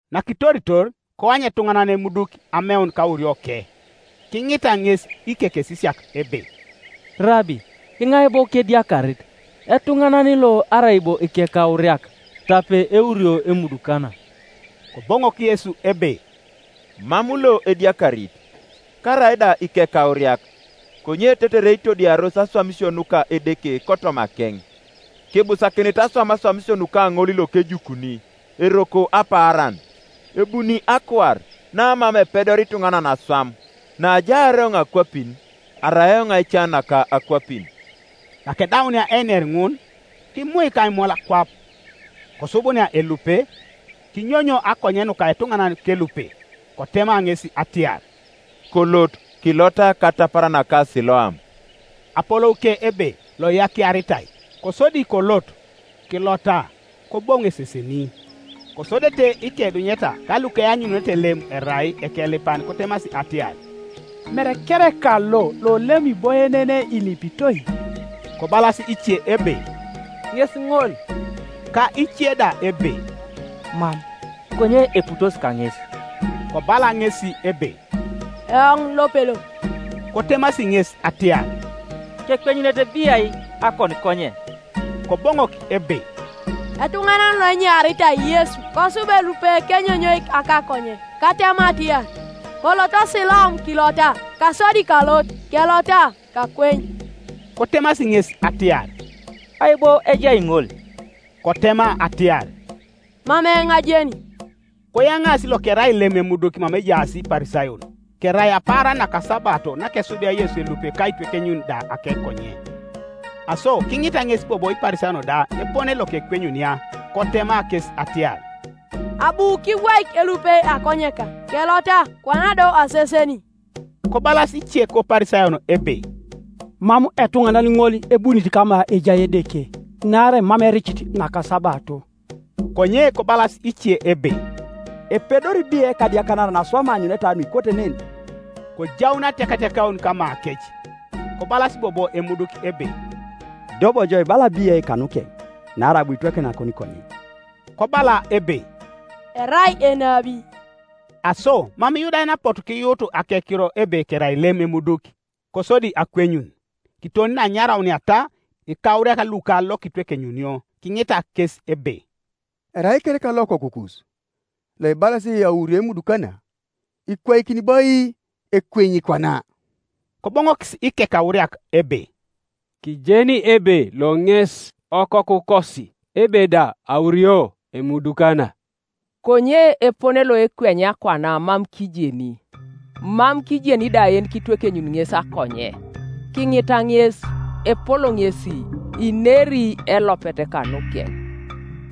Nakitoritor, koany etuŋanan emuduki ameun kaurioke. Kiŋita ŋes ikekesisiak ebe, “Rabi, iŋai bo kediakarit, etuŋanan lo arai bo ikekauriak, tape eurio emudukana?” Koboŋok Yesu ebe, “Mam lo ediakarit, karaida ikekauriak; konye tetere itodiaros aswamisio nuka Edeke kotomakeŋ. Kibusakinit aswam aswamisio nuka ŋol lokejukuni, eroko apaaran; ebuni akuar, namam epedoria ituŋanan aswam. Naajaar eoŋ akwapin, arai eoŋ aica naka akwapin.” Nakedaunia einer ŋun, kimuik aimul kwap, kosubunia elupe, kinyonyo akonye nuka etuŋanan kelupe, Kotema ŋes atiar, “Kolot kilota katapar naka Siloam” (apolouke ebe Loiyakiaritai), Kosodi kolot, kilota, koboŋu eseseni, Kosodete ikeidunyeta ka lukeanyununete lem erai ekelipan kotemasi atiar, “Mere kereka lo lolem iboienenei ilipitoi?” Kobalas ice ebe, “Ŋes ŋol”; ka ice da ebe, “Mam, konye eputosi kaŋes.” Kobala ŋesi ebe, “Eoŋ lopelo.” Kotemasi ŋes atiar, “Kekwenyunete biai akonikonye?” Koboŋok ebe, “Etuŋanan loenyaritai Yesu kosub elupe kenyonyoik akakonye katema atiar, ‘Kolot Siloam kilota’; kasodi kalot, kelota, kakweny.” Kotemasi ŋes atiar, “Ai bo ejai ŋol?” Kotema atiar, “Mam eoŋ ajeni.” Koyaŋaasi lokerai lem emuduki mama ejaas Iparisayon. Kerai apaaran nakasabato nakesubia Yesu elupe ka aitwekenyun da akekonye. Aso kiŋita ŋes bobo Iparisayon da epone lokekwenyunia, Kotema kes atiar, “Abu kibwaik elupe akonyeka, kelota, kwana do aseseni.” Kobalas ice koParisayon ebe, “Mam etuŋanan ŋol ebunit kama ejai Edeke, naarai mam ericit nakasabato.” Konye kobalas ice ebe, “Epedori biai ekadiakanaran aswam aanyuneta nuikote nen?” Kojaun atiakatiakaun kamakec. Kobalas bobo emuduki ebe, “Ido bo jo ibala biai kanukeŋ, naarai abu kitwekeny akonikonyen?” Kobala ebe, “Erai enabi.” Aso mam Iyudayan apotu kiyuut akekiro ebe kerai lem emuduki, kosodi akwenyun, kiton neanyarauniata ikauriak luka lokitwekenyunio, kiŋita kes ebe, “Erai kereka lo okokukus? Loibalasi aurio emudukana? Ikwaikini bo ai ekwenyi kwana?” Koboŋokis ikekauriak ebe, “Kijeni ebe lo ŋes okokukosi, ebe da aurio emudukana; konye epone loekwenyia kwana mam kijeni; mam kijeni da yenikitwekenyuni ŋes akonye. Kiŋita ŋes; epol ŋesi, ineri elopet kanukeŋ.”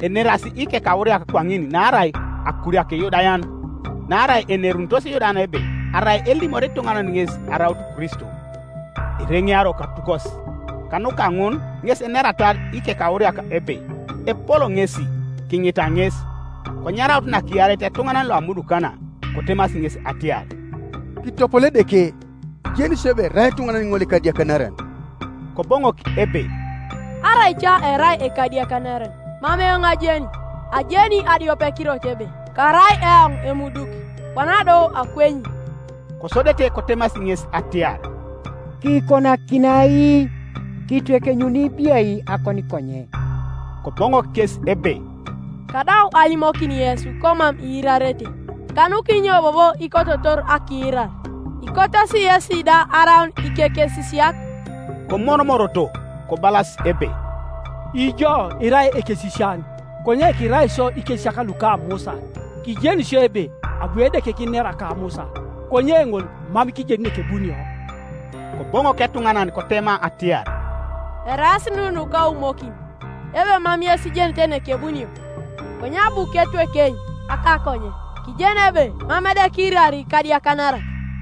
Enerasi ikekauriak kwaŋin naarai akuriaka Iyudayan; naarai enerunitos Iyudayan ebe arai elimori ituŋanan ŋes araut Kristo, ireŋeario katukos. Kanuka ŋun ŋes eneratar ikekauriak ebe, “Epol ŋesi; kiŋita ŋes.” Konyaraut nakiareit etuŋanan loamudukana, kotemasi ŋes atiar, “Kitopolo Edeke; kijeni isio ebe erai etuŋanan ŋol ekadiakanaran.” Koboŋok ebe, “Arai ca erai ekadiakanaran, mam eoŋ ajeni; ajeni adiopekirot ebe karai eoŋ emuduki, kwana do akwenyi.” Kosodete kotemasi ŋes atiar, “Kiikonakini ai? Kiitwekenyuni biai akonikonye?” Koboŋok kes ebe, “Kadau alimokin yesi komam iirarete. Kanukinyo bobo ikototor akiirar? Ikotosi yesi da araun ikekesisiak?” Komoromoroto, kobalas ebe, “Ijo irai ekekesisian; konye kirai isio ikesisiak luka Musa. Kijeni isio ebe abu Edeke kinera ka Musa; konye ŋol mam kijeni nekebunio.” Koboŋok etuŋanan kotema atiar, “Eraas nu nukaumokin, ebe mam yes ijenete nekebunio, konye abu ketwekeny akakonye. Kijeni ebe mam Edeke iirari ikadiakanarak;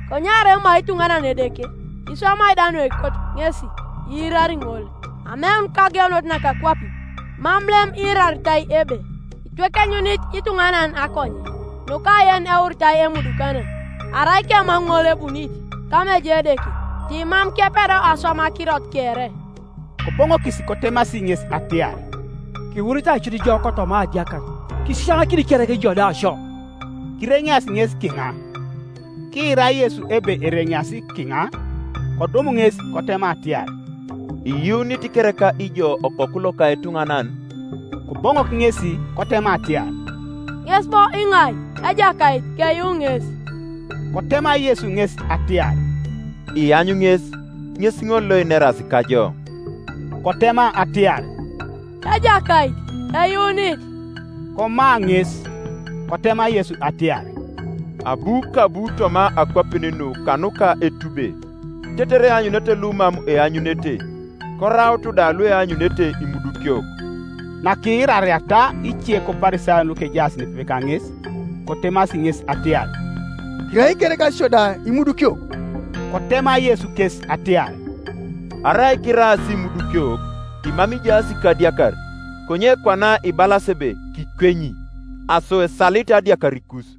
konye arai emai ituŋanan Edeke, iswamai da nuekoto ŋesi, iirari ŋol. Ameun kageunet naka akwapin mam lem iiraritai ebe itwekenyunit ituŋanan akonye nuka yeneuritai emudukana. Arai kemam ŋol ebunit kama ejai Edeke, ti mam kepedo aswam akirot kere.” Koboŋokis kotemasi ŋes atiar, “Kiwuritai cut jo kotoma adiakar, kisisianakini kereka ijo da sio?” Kireŋeasi ŋes kiŋa. Kiira Yesu ebe ereŋeasi kiŋa, kodum ŋes kotema atiar, “Iyuunit kereka ijo Okoku loka etuŋanan” Koboŋok ŋesi kotema atiar, “Ŋes bo iŋai, Ejakait, keyuu ŋes?” Kotema Yesu ŋes atiar, “Iany ŋes, ŋes ŋol loineras kajo.” Kotema atiar, “Ejakait, eyuunit.” Komaa ŋes. Kotema Yesu atiar, “Abu kabu toma akwapin nu kanuka etube, tetere eanyunete lumam eanyunete, koraut da lueanyunete imudukiok.” Nakiirariata ice koParisayon lukejaas nepepe kaŋes, kotemasi ŋes atiar, “Kirai kereka isio da imudukiok?” Kotema Yesu kes atiar, “Arai kiraas imudukiok, timam ijaas kadiakar; konye kwana ibalasi ebe ‘Kikwenyi,’ aso esalit adiakarikus.”